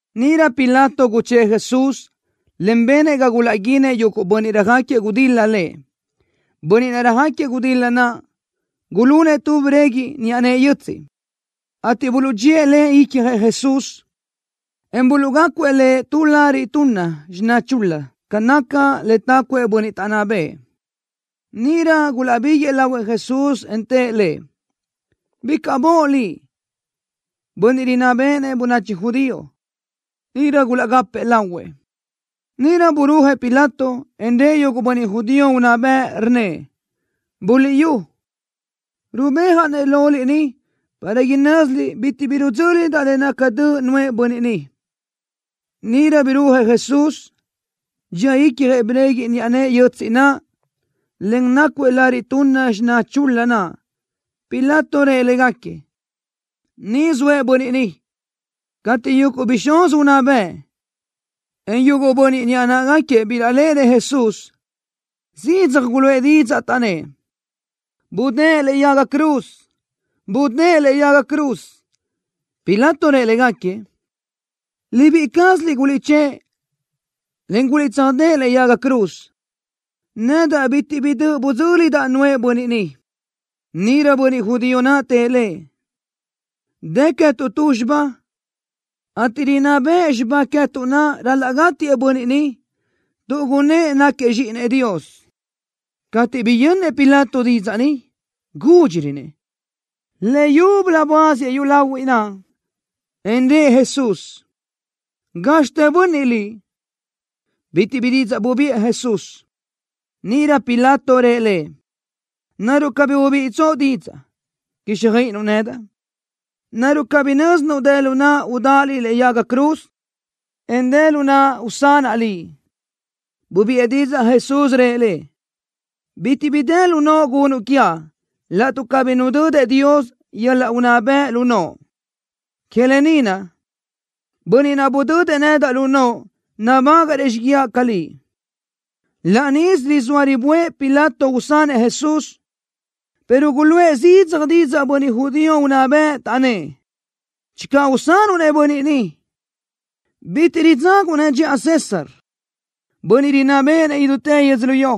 Níʼirö Pilato guchë́ʼë Jesús, en benëʼ ga gulaʼguínëʼ yuguʼ bönniʼ röjáquiëʼ gudil-la Lëʼ. Bönniʼ röjáquiëʼ gudil-la naʼ gulunëʼ tu breguiʼ niʼa nëʼe yötsiʼ, ateʼ buluʼdxíëʼ le icjëʼ Jesús, en buluʼgácuëʼ Lëʼ tu lariʼ tunna xiná chul-la ca naca le tácuëʼ bönniʼ taʼnná bëʼë. Níʼirö gulaʼbiguëʼë lahuëʼ Jesús, en tëʼ Lëʼ: —¡Bicaʼ boʼ Liʼ, Bönniʼ Rinná Béʼenëʼ Bönachi Judío! Níʼirö gulaʼgápëʼë lahuëʼ. Níʼirö burúajëʼ Pilato, en rëʼ yuguʼ bönniʼ judío unná bëʼ, rnnëʼ: —Buliʼyú, rubéajaʼ-nëʼ loliʼ ni para inö́ziliʼ bitiʼ bi rudzö́lidaʼ le naca döʼ nuʼë bönniʼ ni. Níʼirö birúajëʼ Jesús, dxía icjëʼ breguiʼ niʼa nëʼe yötsiʼ naʼ, en nácuëʼ lariʼ tunna xiná chul-la naʼ. Pilato rëʼ légaquiëʼ: —Ni zoëʼ bönniʼ ni. Cateʼ yuguʼ bixúz unná bëʼ, en yuguʼ bönniʼ niʼa náʼagaquiëʼ bilaʼléʼenëʼ Jesús, zidzaj guluʼë didzaʼ, taʼnnë́ʼ: —¡Budë́ʼë lëʼe yaga cruz! ¡Budë́ʼë lëʼe yaga cruz! Pilato rëʼ légaquiëʼ: —Libíʼi cázaliʼ guliʼchë́ʼë, en guliʼtsöjdë́ʼë lëʼe yaga cruz. Nedaʼ bitiʼ bi döʼ budzö́lidaʼ nuʼë bönniʼ ni. Níʼirö bönniʼ judío naʼ tëʼ lëʼ: —Dë queë́tuʼ tu xibá, ateʼ rinná bëʼ xibá queë́tuʼ naʼ ral-laʼ gátiëʼ bönniʼ ni tuʼ gunnë́ʼ náquiëʼ Zxíʼinëʼ Dios. Cateʼ biyönnëʼ Pilato didzaʼ ni, gúdxirönëʼ. Leyúbölö buáziëʼ yúlahuiʼ naʼ, en rëʼ Jesús: —¿Gázxitë bönniʼ Liʼ? Bitiʼ bi didzaʼ bubiʼë Jesús. Níʼirö Pilato rëʼ Lëʼ: —¿Naruʼ cabí ubíʼitsoʼ didzaʼ, quíxjöiʼinuʼ nedaʼ? ¿Naruʼ cabí nö́zinuʼ dë lu naʼa udáʼa Liʼ lëʼe yaga cruz, en dë lu naʼa usanaʼ Liʼ? Bubiʼë didzaʼ Jesús, rëʼ lëʼ: —Bitiʼ bi dë lu noʼo gunuʼ quiaʼ laʼtuʼ cabí nudödëʼ Dios yöl-laʼ unná bëʼ naʼ lu noʼo. Que lë ni naʼ, bönniʼ naʼ budödëʼ nedaʼ lu noʼo nabágaʼrëʼ xíguiaʼ ca liʼ. Laʼ níʼisö rizóa riböʼë Pilato usanëʼ Jesús, pero guluʼë zidzaj didzaʼ bönniʼ judío unná bëʼ, taʼnnë́ʼ: —Channö usanuʼ-nëʼ bönniʼ ni, bitiʼ ridzaguʼ-nëʼ dxiʼa César, bönniʼ rinná béʼenëʼ idútë yödzölió.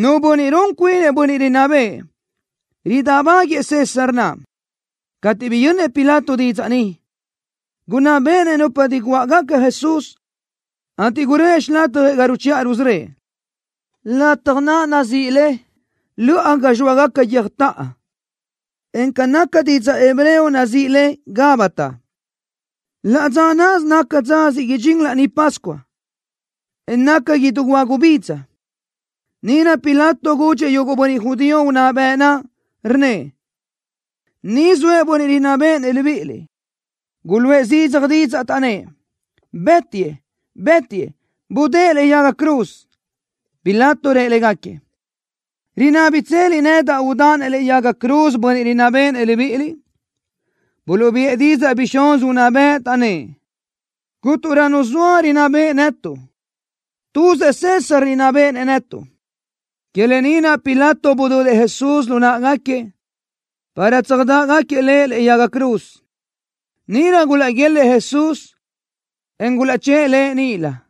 Nu bönniʼ run cuinëʼ bönniʼ rinná bëʼë, ridáʼbáguëʼë César naʼ. Cateʼ biyönnëʼ Pilato didzaʼ ni, gunná béʼenëʼ nupa diguáʼgaca Jesús, ateʼ guröʼë xilatjëʼ ga ruchiʼa rusörö́ëʼ, lataj naʼ nazíʼi le Löʼa Ga Zxóagaca Guiö́jtaʼa, en ca naca didzaʼ hebreo nazíʼi le Gabata. Laʼ dza náʼasö naca dza siʼ idxín Laní Pascua, en naca idú hua gubidza. Níʼirö Pilato gudxëʼ yuguʼ bönniʼ judío unná bëʼ naʼ, rnnëʼ: —Ni zoëʼ bönniʼ rinná béʼenëʼ libíʼiliʼ. Guluʼë zidzaj didzaʼ, taʼnnë́ʼ: —¡Bë́tiëʼ! ¡Bë́tiëʼ! ¡Budë́ʼë lëʼe yaga cruz! Pilato rëʼ légaquiëʼ: —¿Rinábitseliʼ nedaʼ udáʼa-nëʼ lëʼe yaga cruz bönniʼ rinná béʼenëʼ libíʼiliʼ? Buluʼbiʼë didzaʼ bixúz unná bëʼ, taʼnnë́ʼ: —Cúnturö nu zoa rinná beʼe netuʼ. Tuzëʼ César rinná béʼenëʼ netuʼ. Que lë ni naʼ Pilato budödëʼ Jesús lu náʼagaquiëʼ, para tsöjdáʼagaquiëʼ Lëʼ lëʼe yaga cruz. Níʼirö gulaʼguélëʼë Jesús, en gulaʼchë́ʼë Lëʼ níʼilö.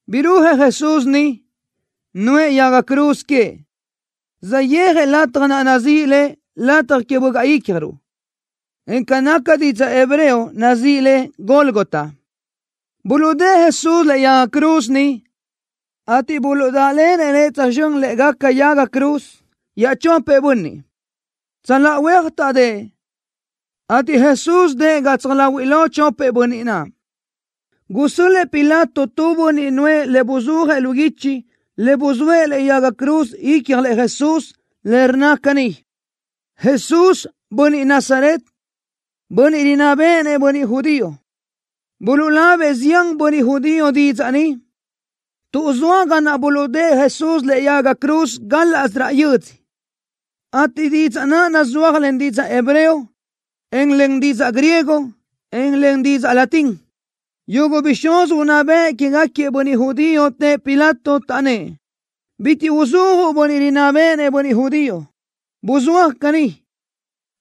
Birúajëʼ Jesús niʼ, nuʼë yaga cruz queëʼ, saʼyéajëʼ lataj naʼ nazíʼi le Lataj Que Bögaʼ Ícjaruʼ, en ca naca didzaʼ hebreo nazíʼi le Gólgota. Buluʼdë́ʼë Jesús lëʼe yaga cruz niʼ, ateʼ buluʼdáʼlenëʼ Lëʼ tsözxö́n lë́ʼegaca yaga cruz iaʼchopëʼ bönniʼ. Tsöláʼa huéaj taʼdë́ʼë, ateʼ Jesús dëʼë gatsaj láhuiʼlö chopëʼ bönniʼ naʼ. Gusö́l-lëʼë Pilato tu bönniʼ nuʼë le buzúajëʼ lu guichi le buzóëʼ lëʼe yaga cruz icjlëʼ Jesús, le rnna caní: “Jesús, Bönniʼ Nazaret, Bönniʼ Rinná Béʼenëʼ Bönniʼ Judío.” Buluʼlabëʼ zián bönniʼ judío didzaʼ ni, tuʼ zoa ga naʼ buluʼdë́ʼë Jesús lëʼe yaga cruz gálaʼsö raʼ yödzö, ateʼ didzaʼ naʼ nuzúajëʼ len didzaʼ hebreo, en len didzaʼ griego, en len didzaʼ latín. Yuguʼ bixúz unná bëʼ quégaquiëʼ bönniʼ judío tëʼ Pilato, taʼnnë́ʼ: —Bitiʼ uzúajuʼ, “Bönniʼ Rinná Béʼenëʼ Bönniʼ Judío.” Buzúaj caní: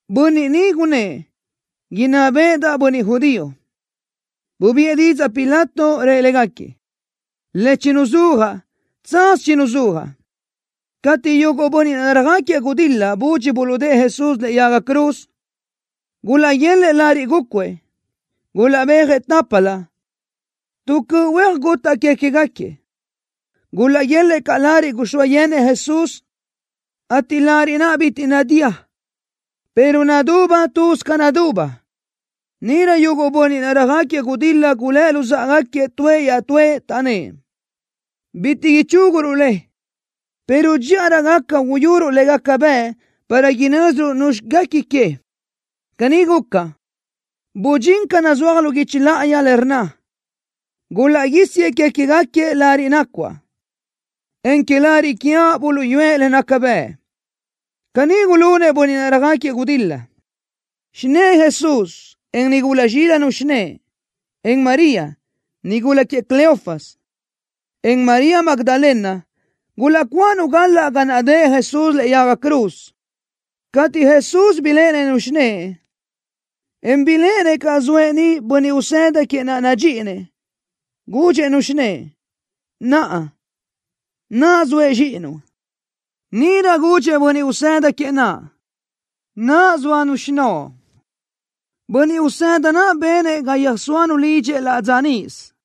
“Bönniʼ ni gunnë́ʼ: Inná béʼedaʼ bönniʼ judío.” Bubiʼë didzaʼ Pilato, rëʼ légaquiëʼ: —Le chinuzúajaʼ, tsaz chinuzúajaʼ. Cateʼ yuguʼ bönniʼ naʼ röjáquiëʼ gudil-la budxi buluʼdë́ʼë Jesús lëʼe yaga cruz, gulaʼguélëʼë lariʼ gúcuëʼ. Gulaʼbéajëʼ tápalö, tu cöʼ huéaj gutaʼ que queë́gaquiëʼ. Gulaʼguélëʼë caʼ lariʼ guxóa yenëʼ Jesús, ateʼ lariʼ naʼ bitiʼ nadía, pero naduba tuz ca naduba. Níʼirö yuguʼ bönniʼ naʼ röjáquiëʼ gudil-la gulë́ luzáʼagaquiëʼ tuëʼ iaʼtúëʼ, taʼnnë́ʼ: —Bitiʼ ichúguruʼ le, pero dxíʼarö gaca uyuruʼ le gaca bëʼ para inö́ziruʼ nuzxi guequi que. Caní guca, budxín ca nazúaj lu guichi láʼayi, le rnna: Gulaʼguísiëʼ que queë́gaquiëʼ lariʼ nacuáʼ, en que lariʼ quiaʼ buluʼyúëʼ le naca bëʼ. Caní gulunëʼ bönniʼ naʼ röjáquiëʼ gudil-la. Xinë́ʼë Jesús, en nigula zxílanu xinë́ʼë, en María, nigula queëʼ Cleofas, en María Magdalena gulaʼcuáʼanu galaʼ ga naʼ dëʼë Jesús lëʼe yaga cruz. Cateʼ Jesús biléʼenëʼ-nu xinë́ʼë, en biléʼenëʼ caʼ zoëʼ niʼ bönniʼ usëda queëʼ naʼ nadxíʼinëʼ, gudxëʼ-nu xinë́ʼë: —Naʼa, naʼ zoëʼ zxíʼinuʼ. Níʼirö gudxëʼ bönniʼ usëda queëʼ naʼ: —Naʼ zóanu xinóʼo. Bönniʼ usëda naʼ benëʼ ga yöjsóanu lidxëʼ laʼ dza níʼisö.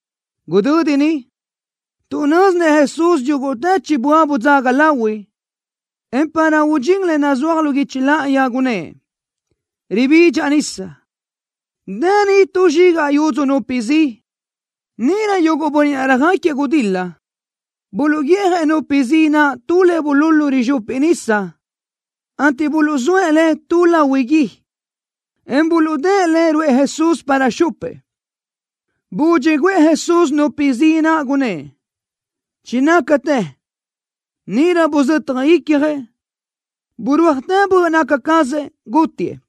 Gudödi ni, tuʼ nö́zinëʼ Jesús yúguʼtë chibö́a budzaga lahui, en para udxín le nazúaj lu guichi láʼayi, gunnë́ʼ: —Ribidxaʼ nisa. Dë niʼ tu zxigaʼ yudzu nupi zi. Níʼirö yuguʼ bönniʼ naʼ röjáquiëʼ gudil-la buluʼguiʼjëʼ nupi zi naʼ tu le bululu rizxupi nisa, ateʼ buluʼzóëʼ le tu lahui gui, en buluʼdë́ʼë le ruʼë Jesús para xupëʼ. Budxi guʼë Jesús nupi zi naʼ, gunnë́ʼ: —Chinácatë. Níʼirö buzötaj icjëʼ. Burúajtë böʼ naca cazëʼ, gútiëʼ.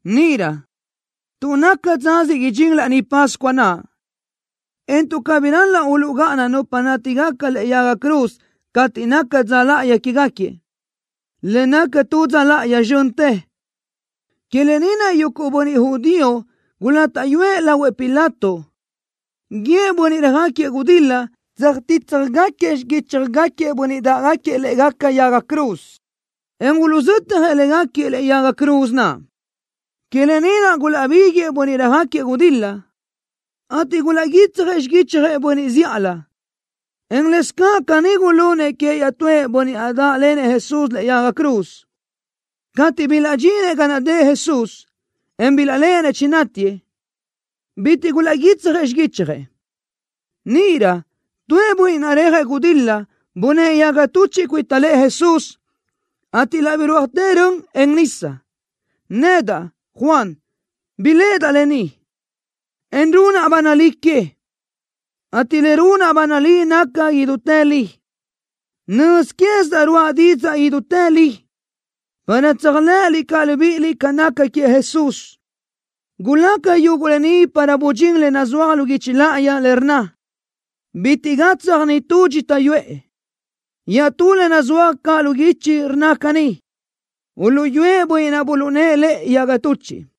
Níʼirö, tuʼ naca dza siʼ idxín Laní Pascua naʼ, en tuʼ cabí ral-laʼ uluʼgáʼana nupa nátigaca lë́ʼegaca yaga cruz cateʼ naca dza láʼayi quégaquiëʼ, le naca tu dza láʼayi zxöntë, que lë ni naʼ yuguʼ bönniʼ judío gulátaʼyuëʼ lahuëʼ Pilato guíëʼ bönniʼ röjáquiëʼ gudil-la tsöjtítsjagaquiëʼ xiguíchjagaquiëʼ bönniʼ dáʼgaquiëʼ lë́ʼegaca yaga cruz, en uluʼzötjëʼ légaquiëʼ lë́ʼegaca yaga cruz naʼ. Que lë ni naʼ gulaʼbiguëʼë bönniʼ röjáquiëʼ gudil-la, ateʼ gulaʼguítsjëʼ xiguichjëʼ bönniʼ zíʼalö, en lëscaʼ caní gulunëʼ queëʼ iaʼtúëʼ bönniʼ naʼ dáʼlenëʼ Jesús lëʼe yaga cruz. Cateʼ bilaʼdxinëʼ ga naʼ dëʼë Jesús, en bilaʼléʼenëʼ chinátiëʼ, bitiʼ gulaʼguítsjëʼ xiguichjëʼ. Níʼirö tuëʼ bönniʼ naʼ reajëʼ gudil-la bunë́ʼë yaga tuchiʼ cuita lëʼë Jesús, ateʼ laʼ birúajtë rön, en nisa. Nedaʼ, Juan, biléʼedaʼ lë ni, en runaʼ ba nalí que, ateʼ le runaʼ ba nalí naca idútë li. Nöz quézidaʼ ruáʼa didzaʼ idútë li, para tséajlëʼëliʼ caʼ libíʼiliʼ ca naca queëʼ Jesús. Gulaca yuguʼ lë ni para budxín le nazúaj lu guichi láʼayi, le rnna: “Bitiʼ gatsaj nitú dxita yuʼë.” Iaʼtú le nazúaj caʼ lu guichi rnna caní: “Uluʼyúëʼ bönniʼ naʼ buluʼnë́ʼë lëʼ yaga tuchiʼ.”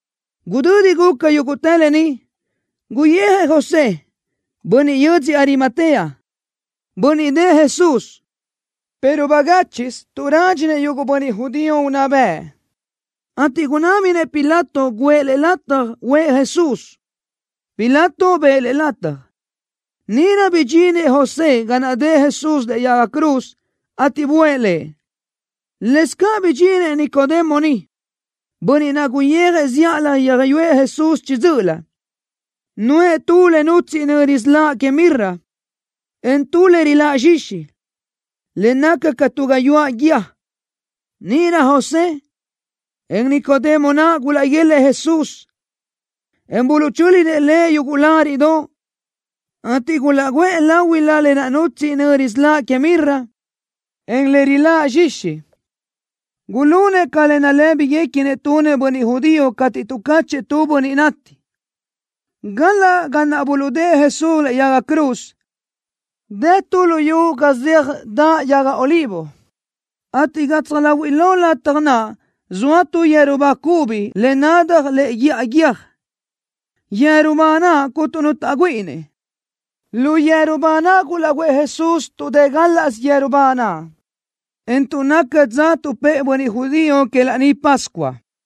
Gudödi guca yúguʼtë lë ni, guyijëʼ José, bönniʼ yödzö Arimatea, bönniʼ dëʼë Jesús, pero bagáchiʼsö tuʼ rádxinëʼ yuguʼ bönniʼ judío unná bëʼ, ateʼ gunábinëʼ Pilato guʼë lëʼ lataj uʼë Jesús. Pilato bëʼë lëʼ lataj. Níʼirö bidxinëʼ José ga naʼ dëʼë Jesús lëʼe yaga cruz, ateʼ buʼë Lëʼ. Lëscaʼ bidxinëʼ Nicodemo niʼ, bönniʼ naʼ guyijëʼ zíʼalö yöjyúëʼ Jesús chiʼi dzö́ʼölö, nuʼë tu le nutsíʼi nöri siláʼ que mirra, en tu le riláʼ zxixi, le naca ca tu gayuáʼ guíë. Níʼirö José, en Nicodemo naʼ gulaʼguélëʼë Jesús, en buluʼchö́linëʼ Lëʼ yuguʼ láriʼdoʼ, ateʼ gulaʼguʼë láhuilö lë naʼ nutsíʼi nöri siláʼ que mirra, en le riláʼ zxixi. Gulunëʼ ca nalë́biguequinëʼ tunëʼ bönniʼ judío cateʼ tuʼcáchëʼë tu bönniʼ nati. Galaʼ ga naʼ buluʼdë́ʼë Jesús lëʼe yaga cruz dë tu luyú ga zeaj daʼ yaga olivo, ateʼ gatsaj láhuiʼlö lataj naʼ zoa tu yeru ba cubi le nadaj lëʼe guíʼa guiö́j, yeru ba naʼ cuntu nu taʼgüíʼinëʼ. Lu yeru ba naʼ gulaʼguʼë Jesús tuʼ dë gálaʼsö yeru ba naʼ, en tuʼ naca dza tuʼpë́ʼë bönniʼ judío que Laní Pascua.